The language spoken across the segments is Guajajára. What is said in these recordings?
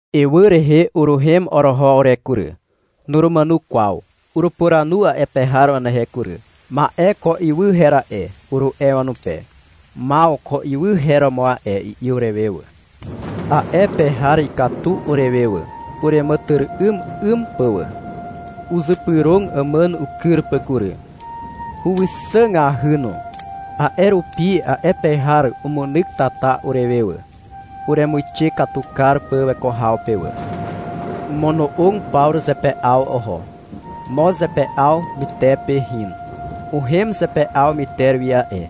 Ywy rehe uruhem oroho ure kury. Nurumàno kwaw. Urupuranu a'e pe har wanehe kury. — Ma'e ko ywy her a'e, uru'e wanupe. — Maw, ko ywy her romo a'e, i'i urewe wà. A'e pe har ikatu urewe wà, ureàmàtyry'ym 'ym pà wà. Uzypyrog àmàn ukyr pà kury. Huwixàgahy no. A'e rupi a'e pe har umunyk tata urewe wà, uremuixe katu kar pà weko haw pe wà. Omono'og Pawru zepe'aw oho. Moz zepe'aw mytepe hin. Uhem zepe'aw myter wi a'e,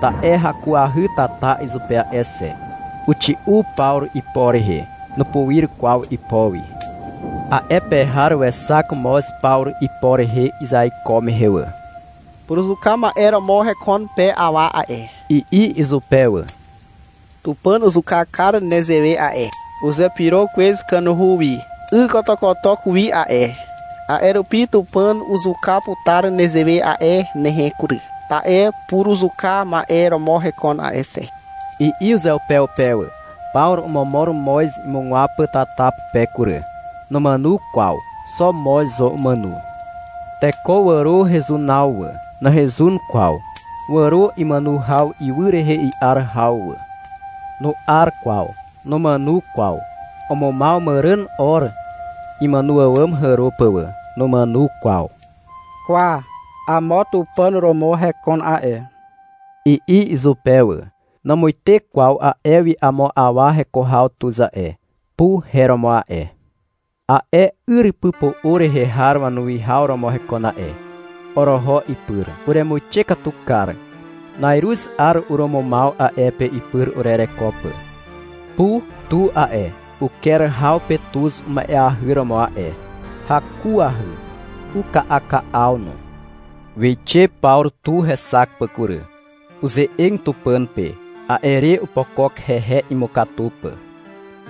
ta'e hakuahy tata izupe a'e xe. Uxi'u Pawru ipo rehe. Nupuir kwaw ipo wi. A'e pe har wexak moz Pawru ipo rehe izeaiko mehe wà. — Puruzuka ma'e romo hekon pe awa a'e, i'i izupe wà. — Tupàn uzuka kar nezewe a'e. Uzepyro kwez kanuhu wi ykotokotok wi a'e. A'e rupi Tupàn uzuka putar nezewe a'e nehe kury, ta'e puruzuka ma'e romo hekon a'e xe, i'i uzeupeupe wà. Pawru omomor moz imugwaw pà tata pupe kury. Numàno kwaw. (Xo moz zo umàno.) Teko wàro hezunaw wà. Nahezun kwaw. Wàro imàno haw ywy rehe i'ar haw wà. Nu'ar kwaw. Numàno kwaw. Umumaw màràn 'or imàno àwàm hàro pà wà. Numàno kwaw. — Kwa, amo tupàn romo hekon a'e, i'i izupe wà. Namuite kwaw a'e wi amo awa heko haw tuz a'e. Pu her romo a'e. A'e yrypypo'o rehe har wanuwihaw romo hekon a'e. Oroho ipyr. Uremuixe katu kar. Na'iruz 'ar urumumaw a'e pe ipyr urereko pà. Pu tu a'e, uker haw pe tuz uma'eahy romo a'e. Hakuahy. Uka'aka'aw no. Wixe Pawru tu hexak pà kury. Uze'eg Tupàn pe. A'e re opokok hehe, imukatu pà.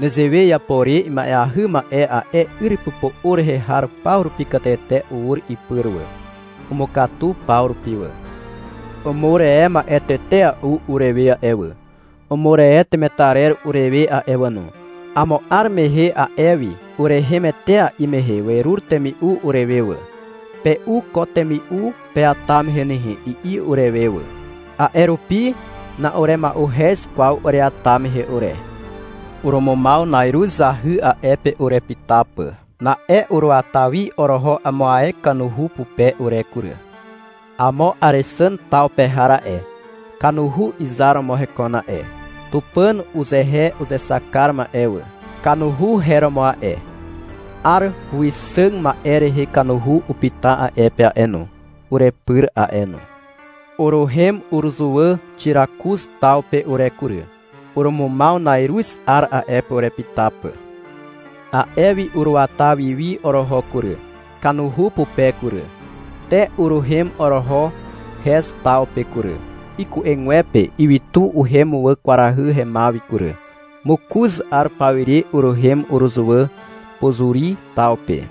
Nezewe iapo re ima'eahy ma'e a'e yrypypo'o rehe har paw rupi katete ur ipyr wà. Umukatu paw rupi wà. Umur e ma'e tetea'u urewe a'e wà, (umur e temetarer urewe a'e wà no). Amo 'ar mehe a'e wi urehem etea'i mehe werur temi'u urewe wà. Pe'u ko temi'u peata mehe nehe, i'i urewe wà. A'e rupi na'urema'uhez kwaw ureata mehe ure. Urumumaw na'iruz zahy a'e pe urepyta pà. Na'e uruata wi oroho amo ae kanuhu pupe ure kury. Amo Àrexàn taw pe har a'e, kanuhu izar romo hekon a'e. Tupàn uzehe uzexak kar ma'e wà, kanuhu her romo a'e. 'Ar huwixàg ma'e rehe kanuhu upyta a'e pe a'e no, urepyr a'e no. Uruhem uruzuwà Xirakuz taw pe ure kury. Urumumaw na'iruz 'ar a'e pe urepyta pà. A'e wi uruata wi wi oroho kury, kanuhu pupe kury. Te uruhem oroho Hez taw pe kury. Iku'egwepe ywytu uhem wà kwarahy hemaw wi kury. Mokoz 'ar pawire uruhem uruzuwà Pozuri taw pe.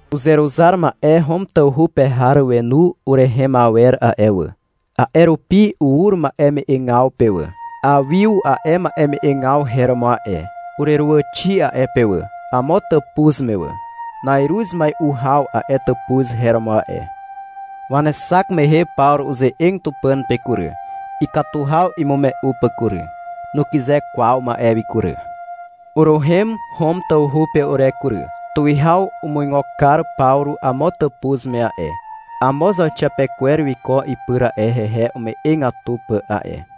Uzeruzar ma'e Hom tawhu pe har wenu urehem awer a'e wà. A'e rupi ur ma'eme'egaw pe wà. Awiu a'e ma'eme'egaw her romo a'e. Ureruwàxi a'e pe wà, amo tàpuz me wà. Na'iruz mai'u haw a'e tàpuz her romo a'e. Wanexak mehe Pawru uze'eg Tupàn pe kury, ikatu haw imume'u pà kury. Nukyze kwaw ma'e wi kury. Uruhem Hom tawhu pe ure kury. Tuwihaw umuigo kar Pawru amo tàpuz me a'e. Amo zauxiapekwer wiko ipyr a'e, hehe ume'egatu pà a'e.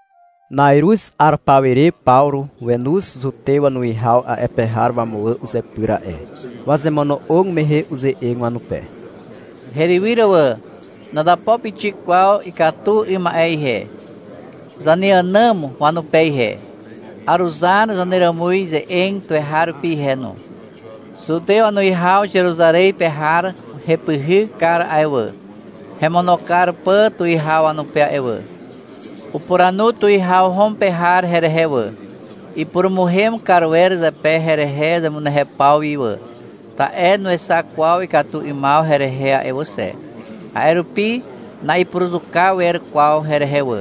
Na'iruz 'ar pawire Pawru wenoz zutew wanuwihaw a'e pe har wamuwà uzepyr a'e. Wazemono'og mehe uze'eg wanupe. — Herywyr wà. Nazapo pixik kwaw ikatu 'ym ma'e ihe, zaneànàm wanupe ihe. Aruzar zaneràmuz ze'eg tuweharupi ihe no. Zutew wanuwihaw Zeruzarez pe har hepyhyk kar a'e wà, hemono kar pà tuwihaw wanupe a'e wà. Upuranu tuwihaw Hom pe har herehe wà. Ipurumuhem kar wer zepe herehe zemunehew paw wi wà. Ta'e nuexak kwaw ikatu 'ymaw herehe a'e wà xe. A'e rupi na'ipuruzuka wer kwaw herehe wà.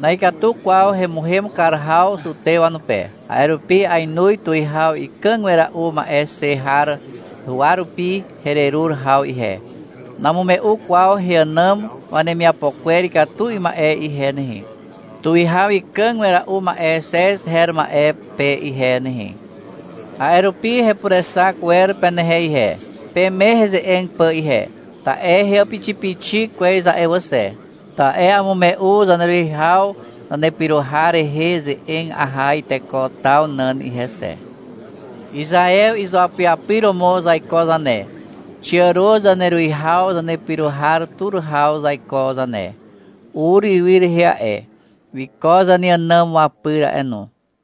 Na'ikatu kwaw hemuhem kar haw zutew wanupe. A'e rupi ainoz tuwihaw ikàg wera'u ma'e xe har huwa rupi hererur haw ihe. Namume'u kwaw heànàm wanemiapo kwer ikatu 'ym ma'e ihe nehe, tuwihaw ikàg wera'u ma'e Xez her ma'e pe ihe nehe. A'e rupi hepurexak wer penehe ihe, peme heze'eg pà ihe. Ta'e heàpixipixi kwez a'e wà xe, ta'e amume'u zaneruwihaw zanepyro har rehe ze'eg aha iteko taw nàn ihe xe. Izaew izuapyapyr romo zaiko zane. Xiàro zaneruwihaw zanepyro har tur haw zaiko zane. Ur ywy rehe a'e. Wiko zaneànàm wapyr a'e no.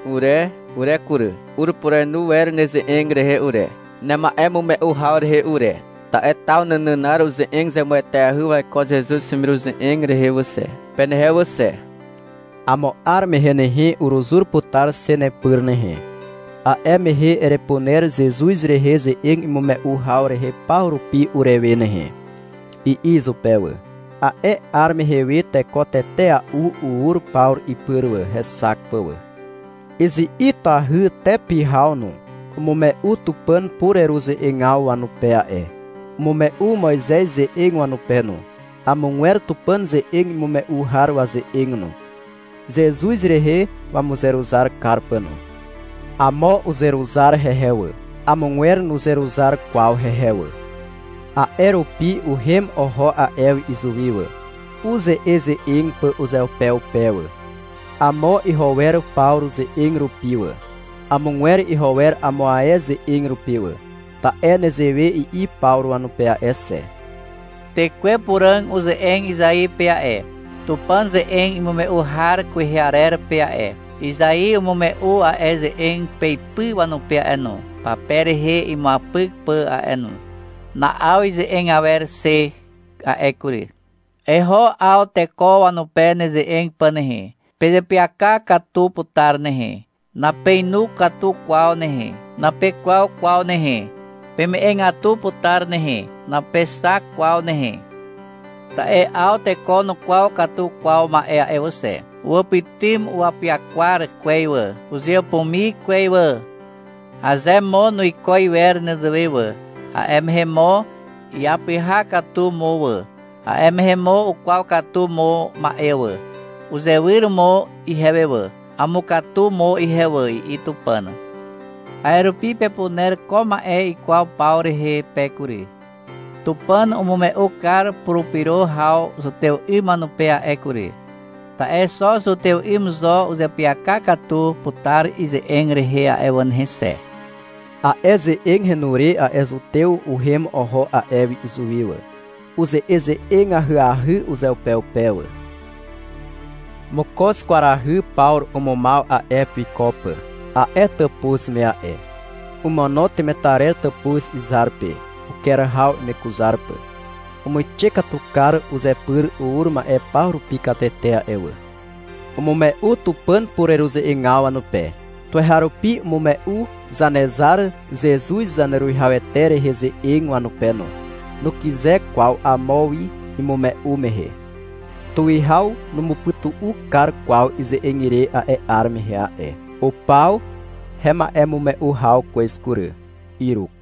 Ure ure kury, urepurenu wer neze'eg rehe ure, nema'emume'u haw rehe ure. Ta'e taw nànànar uze'eg zemueteahy waiko Zezuz hemiruze'eg rehe wà xe, penehe wà xe. — Amo 'ar mehe nehe, uruzur putar xe nepyr nehe. A'e mehe erepuner Zezuz rehe ze'eg imume'u haw rehe paw rupi urewe nehe, i'i izupe wà. A'e 'ar mehe we teko tetea'u ur Pawru ipyr wà, hexak pà wà. Izi'itahy te pyhaw no, umume'u Tupàn pureruze'egaw wanupe a'e. Umume'u Moizez ze'eg wanupe no, amogwer Tupàn ze'eg imume'u har waze'eg no, Zezuz rehe wamuzeruzar kar pà no. Amo uzeruzar hehe wà. Amogwer nuzeruzar kwaw hehe wà. A'e rupi uhem oho a'e wi izuwi wà, uze'eze'eg pà uzeupeupe wà. Amo iho wer Pawru ze'eg rupi wà. Amogwer iho wer amo ae ze'eg rupi wà. Ta'e nezewe i'i Pawru wanupe a'e xe. — Tekwe Puràg uze'eg Izai pe a'e, Tupàn ze'eg imume'u har kwehe arer pe a'e. Izai umume'u a'e ze'eg peipy wanupe a'e no, pape rehe imuapyk pà a'e no. Na'aw ize'eg awer xe a'e kury. Eho 'aw teko wanupe neze'eg pà nehe. — Pezeapyaka katu putar nehe. Napeinu katu kwaw nehe. Napekwaw kwaw nehe. Peme'egatu putar nehe. Napexak kwaw nehe. Ta'e 'aw teko nukwaw katu kwaw ma'e a'e wà xe. Uwàpytym upyakwar kwez wà. Uzeàpumi kwez wà. Aze mo nuiko iwer nezewe wà, a'e mehe mo iapyha katu mo wà. A'e mehe mo ukwaw katu mo ma'e wà. Uzewyr mo ihewe wà. Amukatu mo ihe wà, i'i Tupàn. A'e rupi pepuner ko ma'e ikwaw paw rehe pe kury. Tupàn umume'u kar purupyro haw zutew 'ym wanupe a'e kury. Ta'e xo zutew 'ym zo uzeapyaka katu putar ize'eg rehe a'e wà nehe xe. A'e ze'eg henu re a'e zutew uhem oho a'e wi izuwi wà. Uze'eze'eg ahyahy uzeupeupe wà. Mokoz kwarahy Pawru umumaw a'e pe wiko pà, a'e tàpuz me a'e. Omono temetarer tàpuz izar pe, uker haw imekuzar pà. Umuixe katu kar uzepyr ur ma'e paw rupi katete a'e wà. Umume'u Tupàn pureruze'egaw wanupe. Tuweharupi umume'u Zanezar Zezuz Zaneruwihawete rehe ze'eg wanupe no. Nukyze kwaw amo wi imume'u mehe. Tuwihaw numupytu'u kar kwaw ize'eg ire a'e 'ar mehe a'e. Upaw hema'emume'u haw kwez kury. Iruk.